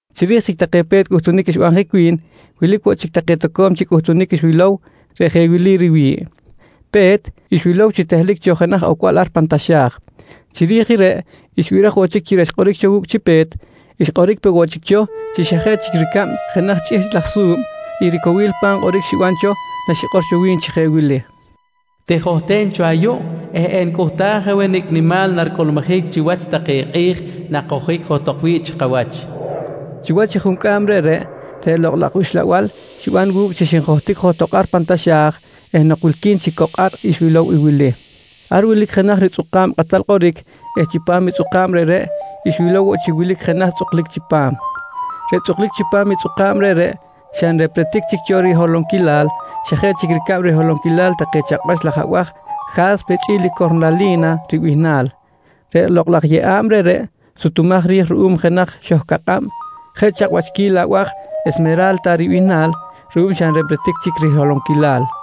Chiri̱j chic take pe̱t cꞌuhtunic xbanjic wi̱n, wilic woꞌ chic take toco̱m chic cꞌuhtunic xwilow reꞌ jeꞌ wili riwi̱ꞌ: Pe̱t, xwilow chi tehlic cho jenaj ocbal ar pan taxa̱j. Chiri̱j i reꞌ xbiraj woꞌ chic chi reꞌ xkꞌoric wu̱cꞌ chi pe̱t, xkꞌoric peꞌ woꞌ chic cho chi xa jeꞌ chic ricab jenaj chꞌihchꞌ laj su̱b i ricowil pa̱m kꞌoric xiban cho naxikꞌor wi̱n chi jeꞌ wili: «Tijohten cho ayuꞌ eh enicꞌuhtaj aweh nicꞌ nimal naricꞌulmujic chiwach take kꞌi̱j nakojic johtok wi̱ꞌ chi kawach, nqui wi̱n. Chiwach i juncꞌam reꞌreꞌ, reꞌ Lokꞌ laj Uxlabal xiban wu̱cꞌ chi xinjohtic johtok ar pan taxa̱j eh nok wilqui̱n chic cok ar xwilow i wili: Ar wilic jenaj ritzꞌukꞌa̱b kꞌatal kꞌoric eh chipam i tzꞌuka̱b reꞌreꞌ xwilow woꞌ chi wilic jenaj tzꞌuklic chipam. Reꞌ tzꞌuklic chipam i tzꞌuka̱b reꞌreꞌ, xa nrepretic chic cho riholonquilal xa jeꞌ chic ricab riholonquil take chakꞌwach laj abaj “Ja̱spe” chꞌi̱l i “Cornali̱na” ribihnal. Reꞌ lokꞌ laj yeꞌa̱b reꞌreꞌ sutumaj ri̱j ruꞌum jenaj xohcakꞌab jeꞌ chakꞌwachquil abaj “Esmera̱lta” ribihnal ruꞌum xa nrepretic chic riholonquilal.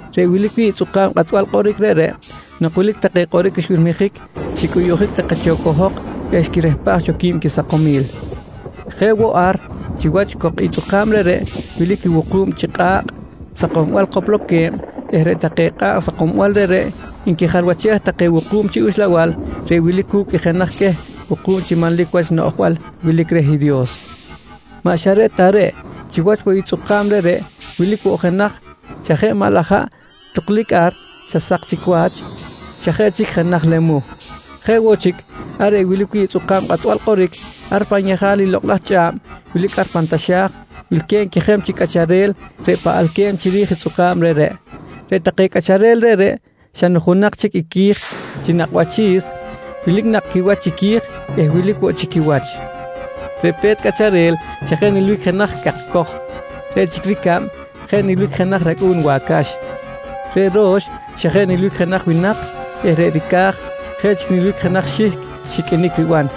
Reꞌ wilic wi̱ꞌ i tzꞌuka̱b kꞌatbal kꞌoric reꞌreꞌ, nok wilic take kꞌoric xbirmijic, xicꞌuyuꞌjic take cho cohok eh xquirehpaj cho quisakomil. Jeꞌ woꞌ, ar chiwach cok i tzꞌuka̱b reꞌreꞌ wilic i wuku̱b chi kꞌa̱kꞌ sakombal kopolque̱b eh reꞌ take kꞌa̱kꞌ sakombal reꞌreꞌ nquijalwachej take wuku̱b chi uxlabal reꞌ wilic cu̱cꞌ i jenaj queh wuku̱b chi manlic wach noꞌjbal wilic reh Dios. Maꞌ xa reꞌ ta reꞌ, chiwach woꞌ i tzꞌuka̱b reꞌreꞌ wilic woꞌ jenaj xa jeꞌ maꞌ laj haꞌ tuklic ar xa sak chic wach, xa jeꞌ chic jenaj lemuh. Jeꞌ woꞌ chic, ar reꞌ wilic wi̱ꞌ i tzꞌuka̱b kꞌatbal kꞌoric, ar pan yejal i lokꞌ laj chꞌa̱b wilic pan taxa̱j, wilque̱b quejeb chi cꞌacharel reꞌ paꞌalque̱b chiri̱j i tzꞌuka̱b reꞌreꞌ. Reꞌ take cꞌacharel reꞌreꞌ xa nujunak chic i qui̱j chi nakꞌ wachi̱s, wilic nakꞌ quiwach chiqui̱j eh wilic woꞌ chi quiwach. Reꞌ pe̱t cꞌacharel xa jeꞌ nilbic jenaj cakcoj. Reꞌ chic ricab jeꞌ nilbic jenaj racꞌu̱n wacax. Reꞌ ro̱x xa jeꞌ nilbic jenaj winak eh reꞌ ricaj jeꞌ chic nilbic jenaj xihcꞌ xiqꞌuinic riban.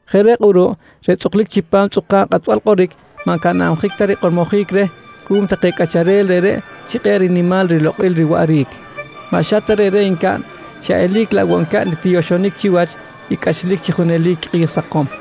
Jeꞌ reꞌ kꞌuruꞌ reꞌ tzꞌuklic chipam tzꞌuka̱b kꞌatbal kꞌoric maꞌ ncanabjic ta rikꞌormojic reh cuꞌum take cꞌacharel reꞌreꞌ chi kꞌe̱ꞌ nimal rilokꞌil riwaꞌric. Maꞌ xa ta reꞌreꞌ ncaꞌn, xa eli̱c laꞌ woꞌ ncaꞌn i tiyoxonic chiwach i cꞌachlic chi junelic kꞌi̱j sakom.